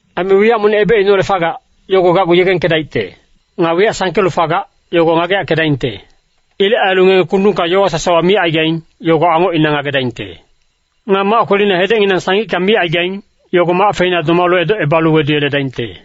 Aime wiyac monic ebecineholec fagac, yogo gacgu yegengkedaicte. Nga wiyac sangkelu fagac, yogo ngageyackedaingte. Ilec ailu ngenge kundungka yowa sasawa micaigaing, yogo angocina ngagedaingte. Nga mac kwelina hedecnginang sangicka migaing, yogo mac feina domalu edocebalu weduyeledaingte.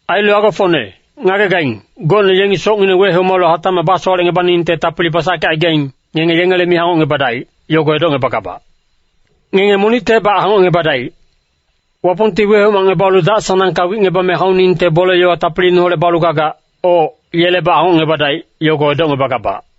“Ailu agofocne, ngagegaing, gocne yengi socngineng wehomalu hatacmac basowalecngebaningte tapili basackecaigaing, ngenge yengele mi hangocngebadaic, yogo edocngebagabac! Ngenge monictebac hangocngebadaic! Wapongti wehomacngebalu dac-sanangka wicngebame hauningte bole-yowa tapiliineholec balu gagac, oc, yelebac hangocngebadaic, yogo edocngebagabac!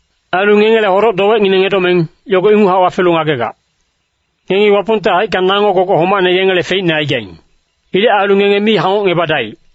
Ailu ngengele hodoc-dowecngineng edomeng, yogo inguchac wafelu ngagegac. Ngengi Wapongte haicka nango gogoc homacne yengele feicne aigaing. Ilec ailu ngenge mi hangocngebadaic.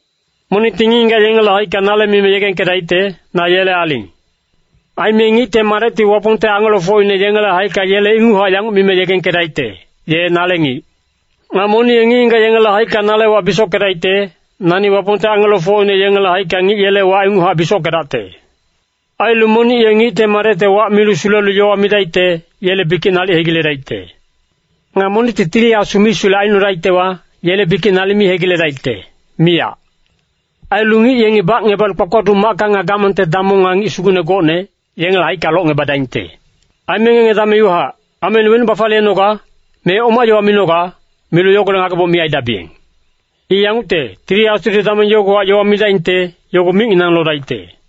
“Monicti ngic-ngigac yengele haicka nale mime yegengkedaicte, ‘Na yele aling.’ Aime Ngicte Madecti Wapongte angelofocine yengele haicka yele inguchac yanguc mime yegengkedaicte, ‘ye nale ngic.’ Nga monic ye ngic-ngigac yengele haicka nale wac bisockedaicte, nani Wapongte angelofocine yengele haicka ngic yele wac inguchac bisockedacte. Ailu monic ye Ngicte Madecte wac milu sulelu yowa midaicte, yele bikic nalic hegiledaicte. Nga monicti Tili Asu misulec aicnodaictewa, yele bikic nalic mi hegiledaicte, miyac. Ailu ngic yengi bacngebalu kpakpaduc macka nga gamangte damong nga ngic sugucne gocne, yengele haicka locngebadaingte. Aime ngenge dameng iwahac, ‘Ameine wenuc bafaliyenoga?’ me ‘Oma yowa minoga?’ milu yogolec ngageboc mi aidabiyeng! I yangucte, Tili Asudi dameng yogowahac yowa midaingte, yogo micnginang lodaicte.”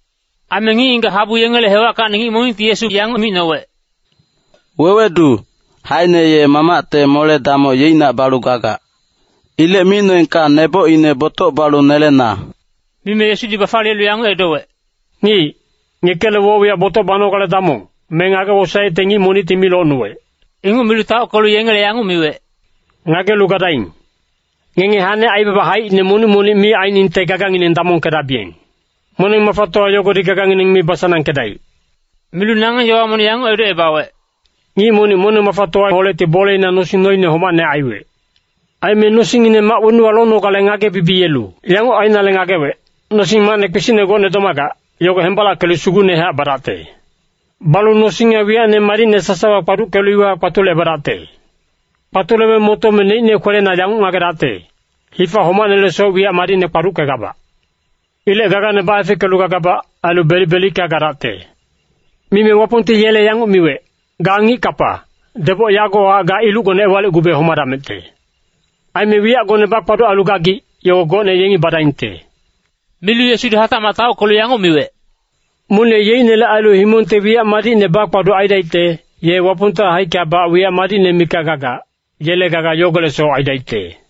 Aime ngic-ngigac habu yengele hewackacni ngic monicti Yesu yanguc micnowec, “Wewedu, haene ye mamacte mole-damoc yeicnac balu gagac. Ilec micnoengka nebocine botoc balu nelena.” Mime Yesudi bafaliyelu yanguc edowec, “Ngic, ngekele woc-wiyac botoc banogale damong, me ngage-wosaecte ngic monicti mi locnuwec.” Inguc milu taockelu yengele yanguc miwec, “Ngagelu gadaing! Ngenge hane aibaba haicine monic-monic mi ainingte gagangineng damongkedabiyeng. Moneng-mafatowa yogodi gagangineng mi basanangkedaic!” Milu nangeng yowa monic yanguc edocebawec, “Ngic monic moneng-mafatowaholecti boleina nosing noine homacne aiwec. Aime nosingngine mac wenuwa lonogale ngage-bibiyelu yanguc ainale ngagewec, ‘Nosing-macne kpisicne gocne domagac, yogo hembalackelu sugucnehac badacte. Balu nosing nga wiyacne madicne sasawa kpaduckelu iwahac kpatulecebadacte.’ Kpatulebe motome neicne kwelena yanguc ngagedacte, ‘Hifa homacnelesoc wiyac madicne kpaduckegabac. Ilec gagane baefeckelu bagabac, ailu belic-belicka gadacte.’ “Mime Wapongti yele yanguc miwec, ‘Ga ngic-kapa, deboc yagowahac ga ilucgone ewalicgube homadamecte. Aime wiyacgone bakpaduc ailu gagic, yogo gocne yengi badaingte.’” Milu Yesudi hatacmac taockelu yanguc miwec, “Monic ye yeicnele ailu himongte wiyac madicne bakpaduc aidaicte, ye Wapongte haickabac wiyac madicne mikac gagac, yele gaga yogolecsoc aidaicte.”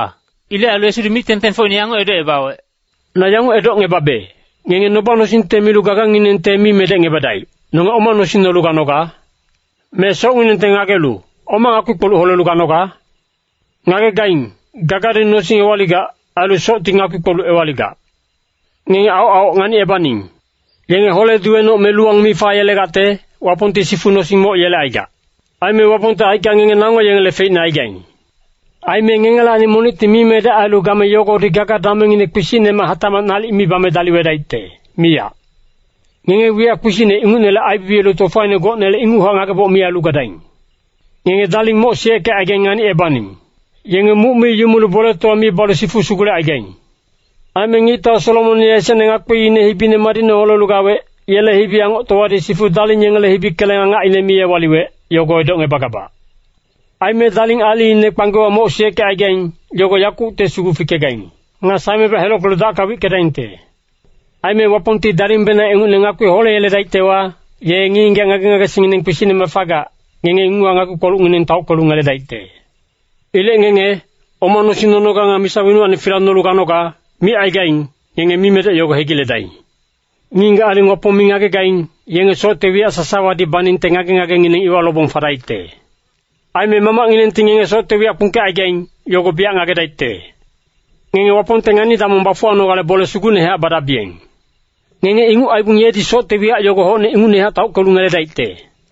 Ilec ailu Yesudi mic-tengtengfocine yanguc edocebawec, “Na yanguc edocngebabe, ngenge noba-nosingte milu gaganginengte mi medecngebadaic, ‘Nonge oma nosing nolu ganoga?’ Me socnginengte ngagelu, ‘Oma ngakpi-kpoluc holelu ganoga?’ Ngagegaing, gagadi nosing ewaligac, ailu socti ngakpi-kpoluc ewaligac. Ngenge aoc-aoc nganicebaning! Yenge hole-duwenoc me luwang mi fayelegacte, Wapongti sifu nosing moc yelecaigac. Aime Wapongte haicka ngenge nango yengele feicne aigaing. Aime ngengelacni monicti mimedec ailu game yogodi gaga-damengngine kpisicnemac hatacmac nalic mi bame daliwedaicte, miyac. Ngenge wiyac kpisicne ingucnele aibibiyelu tofaine gocnele inguchac ngageboc mi ailu gadaing! “Ngenge daling moc siyeckecaigaing nganicebaning! Yenge muc mi yumulu boletowa mi balu sifu sugulecaigaing. Aime ngictau Solomon ye esecne ngakpiine hibine madicne holelu gawec, yele hibi-angoctowadi sifu daling yengele hibi keleng angacine mi ewaliwec, yogo edocngebagabac. Aime daling aliine kpanggewa moc siyeckecaigaing, yogo yakucte sugu fikegaing. Nga saemebac helockelu dacka wickedaingte. Aime Wapongti dalingbenang ingucne ngakpi holeyeledaictewa, ye ngic-ngigac ngage-ngagesingngineng kpisicnemac fagac, ngenge inguchac ngakpi-kpolucngineng taockelu ngeledaicte. “Ilec ngenge, ‘oma nosing nonoga nga misa wenuwacni fila nolu ganogale’ micaigaing, ngenge mimedec yogo hegiledaing! Ngic-ngigac aling Wapong mi ngagegaing, yenge socte wiyac sasawadi baningte ngage-ngagengineng iwa lobong fadaicte. Aime Mamacnginengti ngenge socte wiyac kpungkecaigaing, yogo biyac ngagedaicte. Ngenge Wapongte ngani-damong bafuwanogale bole sugucnehac badabiyeng. Ngenge inguc aibong yedi socte wiyac yogo hocne ingucnehac taockelu ngeledaicte.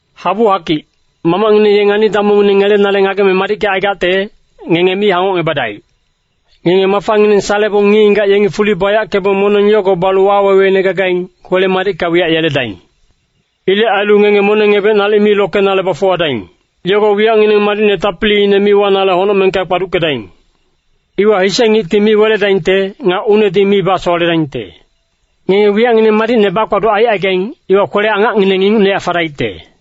“Habu-hakic, Mamacngineng ye ngani-damongngine ngelenale ngageme madickecaigacte, ngenge mi hangocngebadaic! Ngenge mafangineng salebong ngic-ngigac yengi fuli bayackebong moneng yogo balu waweweine gagaing, kwele-madicka wiyac yeledaing. Ilec ailu ngenge moneng-ebec nalic mi lokenale bafuwadaing. Yogo wiyacngineng madicne tapiliine mi wanale honocmengka kpaduckedaing. Iwa hise ngicti mi weledaingte, nga unedi mi basowaledaingte. Ngenge wiyacngineng madicne bakpaduc aicaigaing, iwa kwele-angacngineng ingucnehac fadaicte.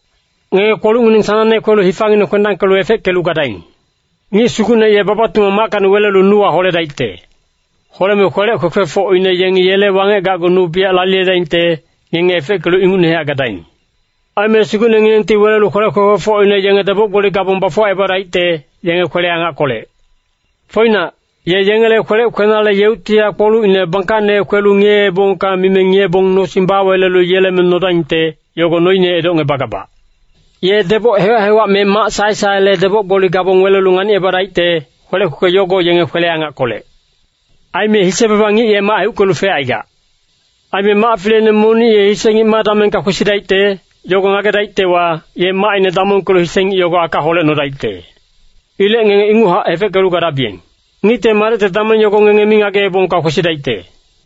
“Ngenge kpolucngineng sanangne kwelu hifangineng kwendangkelu efeckelu gadaing. Ngic sugucne ye baba-tumang mackacni welelu nuwa holedaicte. Holeme kwelec kwekwefocine yengi yele wangec gacgu nu biyac laliyedaingte, ngenge efeckelu ingucnehac gadaing. Aime sugucnenginengti welelu kwelec kwekwefocine yenge deboc-gboli gabong bafuwacebadaicte, yenge kwele-angackolec. Foinac, ye yengele kwelec kwenale yeuctihac kpolucine bangkacne kwelu ‘ngiyeebongka’ mime ngiyebong nosing bawelelu yeleme nodaingte, yogo noine edocngebagabac. Ye deboc hewac-hewac me mac sae-saele deboc-gboli gabong welelu nganicebadaicte, kwelec kwekwe yogo yenge kwele-angackolec. “Aime hise-baba ngic ye mac heuckelu fecaigac. Aime mac fileine monic ye hise ngic ma damengka kwesidaicte, yogo ngagedaictewa, ye macine damongkelu hise ngic yogo aka holecnodaicte. Ilec ngenge inguchac efeckelu gadabiyeng. Ngicte Madecte dameng yogo ngenge mi ngageebongka kwesidaicte.”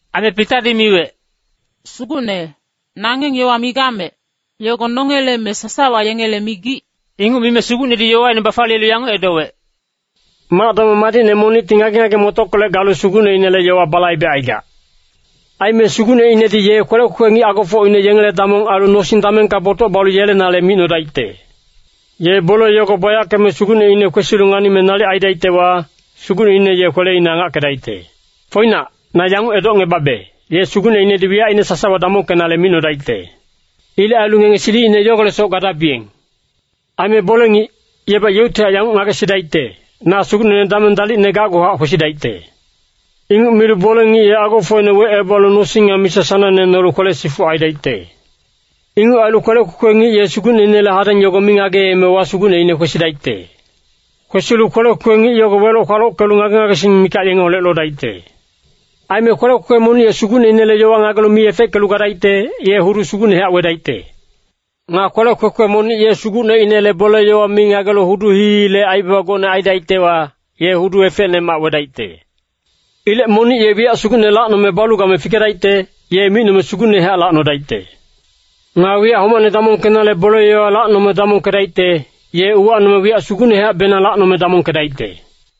Aime Pitadi miwec, “Sugucne, nangeng yowa migamec, yogo nongele me sasawa yengele migic?” Inguc mime Sugucnedi yowaine bafaliyelu yanguc edowec, “Mac-damong madicne monicti ngage-ngage-motockolec galu sugucneinele yowa balaibecaigac. Aime sugucneinedi ye kwelec kwekwe ngic agofocine yengele damong ailu nosing damengka botoc balu yelenale micnodaicte. Ye bole yogo bayackeme sugucneine kwesilu nganime nalic aidaictewa, sugucneine ye kweleine angackedaicte. Foinac, na yanguc edocngebabe, ye sugucneinedi wiyacine sasawa damongkenale micnodaicte. Ilec ailu ngenge silicine yogolecsoc gadabiyeng. Aime bole-ngic, yebac yeuctihac yanguc ngagesidaicte, ‘Na sugucnene dameng dalicne gacguhac kwesidaicte.’ Inguc milu bole-ngic ye agofocine wecebalu nosing nga misa sanangne nolu kwele-sifuc aidaicte. Inguc ailu kwelec kwekwe ngic ye sugucneinele hadeng yogo mi ngageemewa sugucneine kwesidaicte. Kwesilu kwelec kwekwe ngic yogo weloc-kwalockelu ngage-ngagesing mikac yengeholec lodaicte. “Aime kwelec kwekwe monic ye sugucneinele yowa ngagelu mi efeckelu gadaicte, ye hudu sugucnehac wedaicte. Nga kwelec kwekwe monic ye sugucneinele bole-yowa mi ngagelu hudu hii-hiile aibaba gocne aidaictewa, ye hudu efecnemac wedaicte. Ilec monic ye wiyac sugucne lacnome balu game fikedaicte, ye micnome sugucnehac lacnodaicte. Nga wiyac homacne damongkenale bole-yowa lacnome damongkedaicte, ye uwacnome wiyac sugucnehacbenang lacnome damongkedaicte.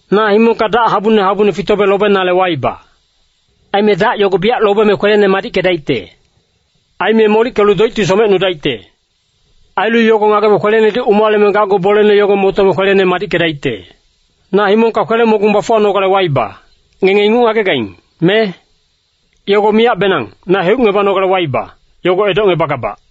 “Na himongka dac habune habune fitobe lobenale waiba. Aime dac yogo biyac lobeme kwelene madickedaicte. Aime molickelu doicti somecnudaicte. Ailu yogo ngagebe kwelenedi umaleme gacgu bolene yogo motome kwelene madickedaicte. Na himongka kwele-mogung bafuwanogale waiba, ngenge inguc ngagegaing, me? Yogo miyacbenang, na heucebanogale waiba, yogo edocngebagabac.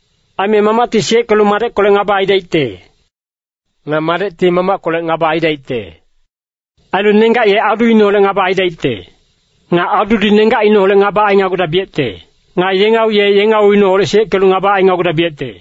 Aime mamacti siyeckelu madeckolec ngaba aidaicte. Nga madecti mamackolec ngaba aidaicte. Ailu nenggac ye aduineholec ngaba aidaicte. Nga adudi nenggacineholec ngaba ainagudabiyecte. Nga yengau ye yengauineholec siyeckelu ngaba ainagudabiyecte.”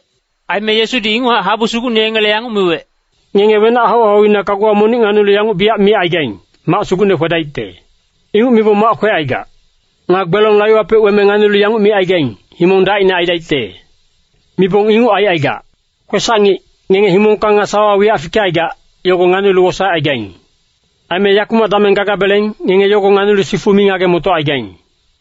Aime Yesudi inguchac habu sugucne yengele yanguc miwec, “Ngenge wenac hau-hauina kaguwa monic nganilu yanguc biyac micaigaing, ‘Mac sugucne kwedaicte.’ Inguc mibong mac kwecaigac. Nga gbelong laiwapec weme nganilu yanguc micaigaing, ‘Himong dacine aidaicte.’ Mibong inguc aicaigac. Kwesac-ngic, ngenge himongka nga sawawa wiyac fikecaigac, yogo nganilu wosaecaigaing. Aime yakumac dameng gagabeleng, ngenge yogo nganilu sifu mi ngage-motocaigaing.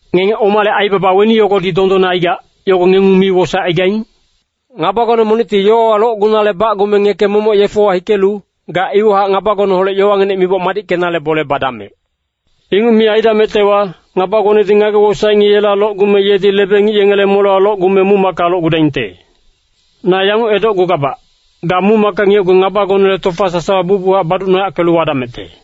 “Ngenge omale aibaba weni yogodi dondonne aigac, yogo ngengung mi wosaecaigaing? Ngabagone monicti yowawa locgunale bacgume ngeke momoc yefewa hikelu, ga iwahac ngabagoneholec yowanginec miboc madickenale bole badamec! Inguc mi aidamectewa, ngabagonedi ngage-wosaec ngic yela locgume yedi lebe-ngic yengele molewa locgume muc-macka locgudaingte. Na yanguc edocgugabac, ga muc-macka ngiyecgu ngabagonele tofa sasawa bucbuchac baducnoyackelu wadamecte.”